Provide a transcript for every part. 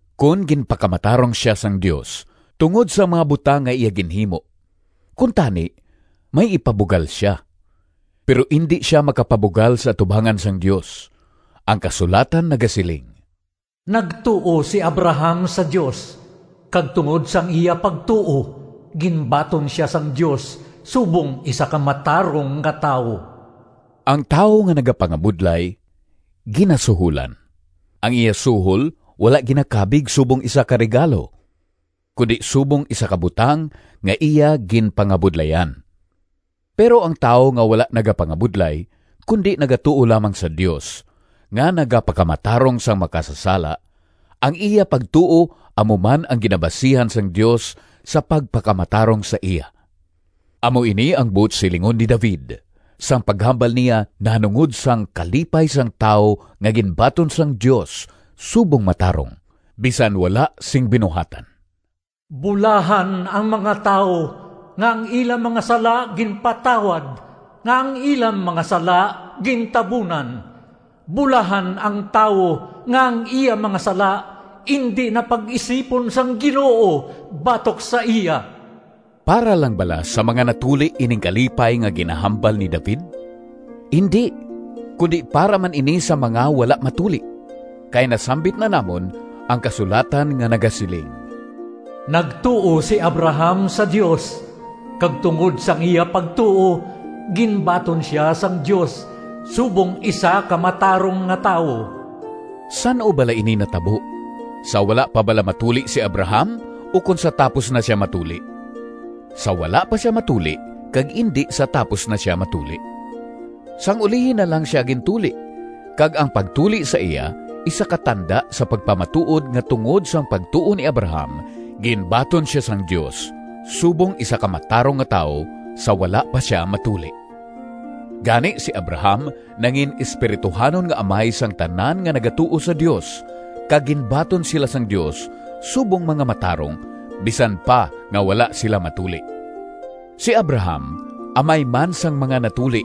Kon ginpakamatarong sia sang Dios tungod sang mga butang nga iya ginhimo, kuntani may ipabugal sia. Pero indi sia makapabugal sa atubangan sang Dios. Ang kasulatan nagasiling, “Nagtuo si Abraham sa Dios, kag tungod sang iya pagtuo, ginbaton sia sang Dios subong isa ka matarong nga tawo.” Ang tawo nga nagapangabudlay ginasuholan. Ang iya suhol wala ginakabig subong isa ka regalo, kundi subong isa ka butang nga iya ginpangabudlayan. Pero ang tawo nga wala nagapangabudlay, kundi nagatuo lamang sa Dios nga nagapakamatarong sang makasasala, ang iya pagtuo amo ang ginabasihan sang Dios sa pagpakamatarong sa iya. Amo ini ang buot silingon ni David sang paghambal niya nahanungod sang kalipay sang tawo nga ginbaton sang Dios subong matarong, bisan wala sing binuhatan: “Bulahan ang mga tawo Nga ang ila mga sala ginpatawad, Nga ang ila mga sala gintabunan! Bulahan ang tawo Nga ang iya mga sala Indi na pag-isipon Sang Ginoo batok sa iya!” Para lang bala sa mga natuli ining kalipay nga ginahambal ni David? Indi, kundi para man ini sa mga wala matuli! Kay nasambit na namon ang kasulatan nga nagasiling, “Nagtuo si Abraham sa Dios kag tungod sang iya pagtuo ginbaton sia sang Dios subong isa ka matarong nga tawo.” San-o bala ini natabo? Sa wala pa bala matuli si Abraham, ukon sa tapos na sia matuli? Sa wala pa sia matuli, kag indi sa tapos na sia matuli. Sang ulihi na lang sia gintuli, kag ang pagtuli sa iya isa ka tanda sa pagpamatuod nga tungod sang pagtuo ni Abraham, ginbaton sia sang Dios subong isa ka matarong nga tawo sa wala pa sia matuli. Gani si Abraham nangin-espirituhanon nga amay sang tanan nga nagatuo sa Dios kag ginbaton sila sang Dios subong mga matarong, bisan pa nga wala sila matuli. Si Abraham amay man sang mga natuli,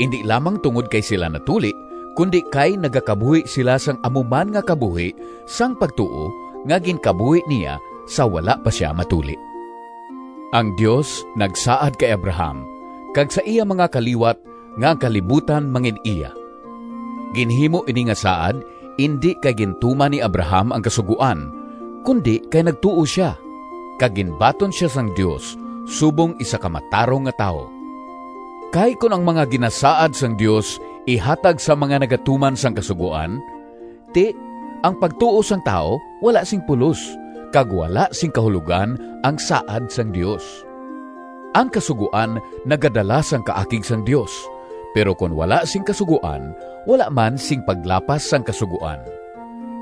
indi lamang tungod kay sila natuli, kundi kay nagakabuhi sila sang amo man nga kabuhi sang pagtuo nga ginkabuhi niya, sa wala pa sia matuli. Ang Dios nagsaad kay Abraham kag sa iya mga kaliwat nga ang kalibutan mangin-iya. Ginhimo ini nga saad, indi kay gintuman ni Abraham ang Kasugoan, kundi kay nagtuo sia, kag ginbaton sia sang Dios subong isa ka matarong nga tawo. Kay kon ang mga ginasaad sang Dios ihatag sa mga nagatuman sang Kasugoan, ti, ang pagtuo sang tawo wala sing pulos kag wala sing kahulogan ang saad sang Dios. Ang Kasugoan nagadala sang kaakig sang Dios, pero kon wala sing kasugoan, wala man sing paglapas sang kasugoan.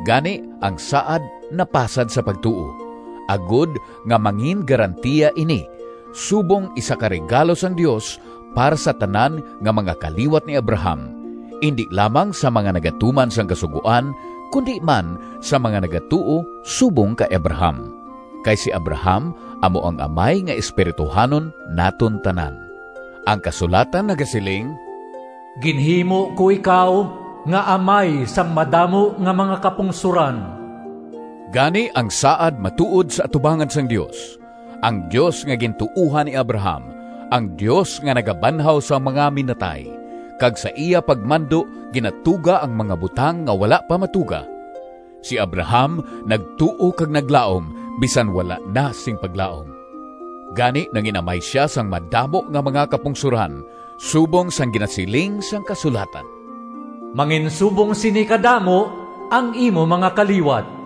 Gani, ang saad napasad sa pagtuo, agod nga mangingarantiya ini subong isa ka regalo sang Dios para sa tanan nga mga kaliwat ni Abraham—indi lamang sa mga nagatuman sang Kasugoan, kundi man sa mga nagatuo subong kay Abraham. Kay si Abraham amo ang amay nga espirituhanon naton tanan. Ang kasulatan nagasiling, “Ginhimo ko ikaw nga amay sang madamo nga mga kapungsoran.” Gani, ang saad matuod sa atubangan sang Dios, ang Dios nga gintuohan ni Abraham—ang Dios nga nagabanhaw sang mga minatay, kag sa iya pagmando ginatuga ang mga butang nga wala pa matuga. Si Abraham nagtuo kag naglaom, bisan wala na sing paglaom. Gani, “nangin-amay sia sang madamo nga mga kapungsoran,” subong sang ginasiling sang kasulatan, “Manginsubong sini kadamo ang imo mga kaliwat.”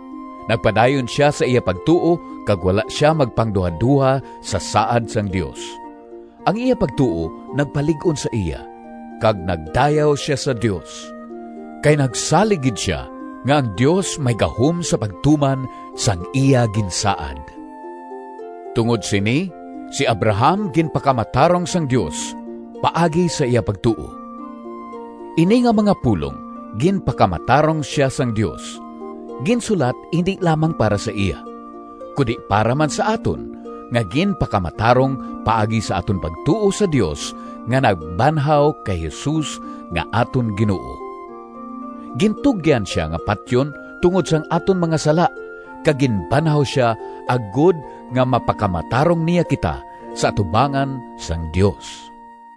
Nagpadayon sia sa iya pagtuo kag wala sia magpangduhadoha sa saad sang Dios. Ang iya pagtuo nagpalig-on sa iya, kag nagdayaw sia sa Dios. Kay nagsalig gid sia nga ang Dios may gahom sa pagtuman sang iya ginsaad. Tungod sini, si Abraham “ginpakamatarong sang Dios,” paagi sa iya pagtuo. Ini nga mga pulong “ginpakamatarong sia sang Dios” ginsulat indi lamang para sa iya, kundi para man sa aton nga ginpakamatarong paagi sa aton pagtuo sa Dios nga nagbanhaw kay Jesus nga aton Ginoo. Gintugyan sia nga patyon tungod sang aton mga sala, kag ginbanhaw sia, agod nga mapakamatarong niya kita sa atubangan sang Dios.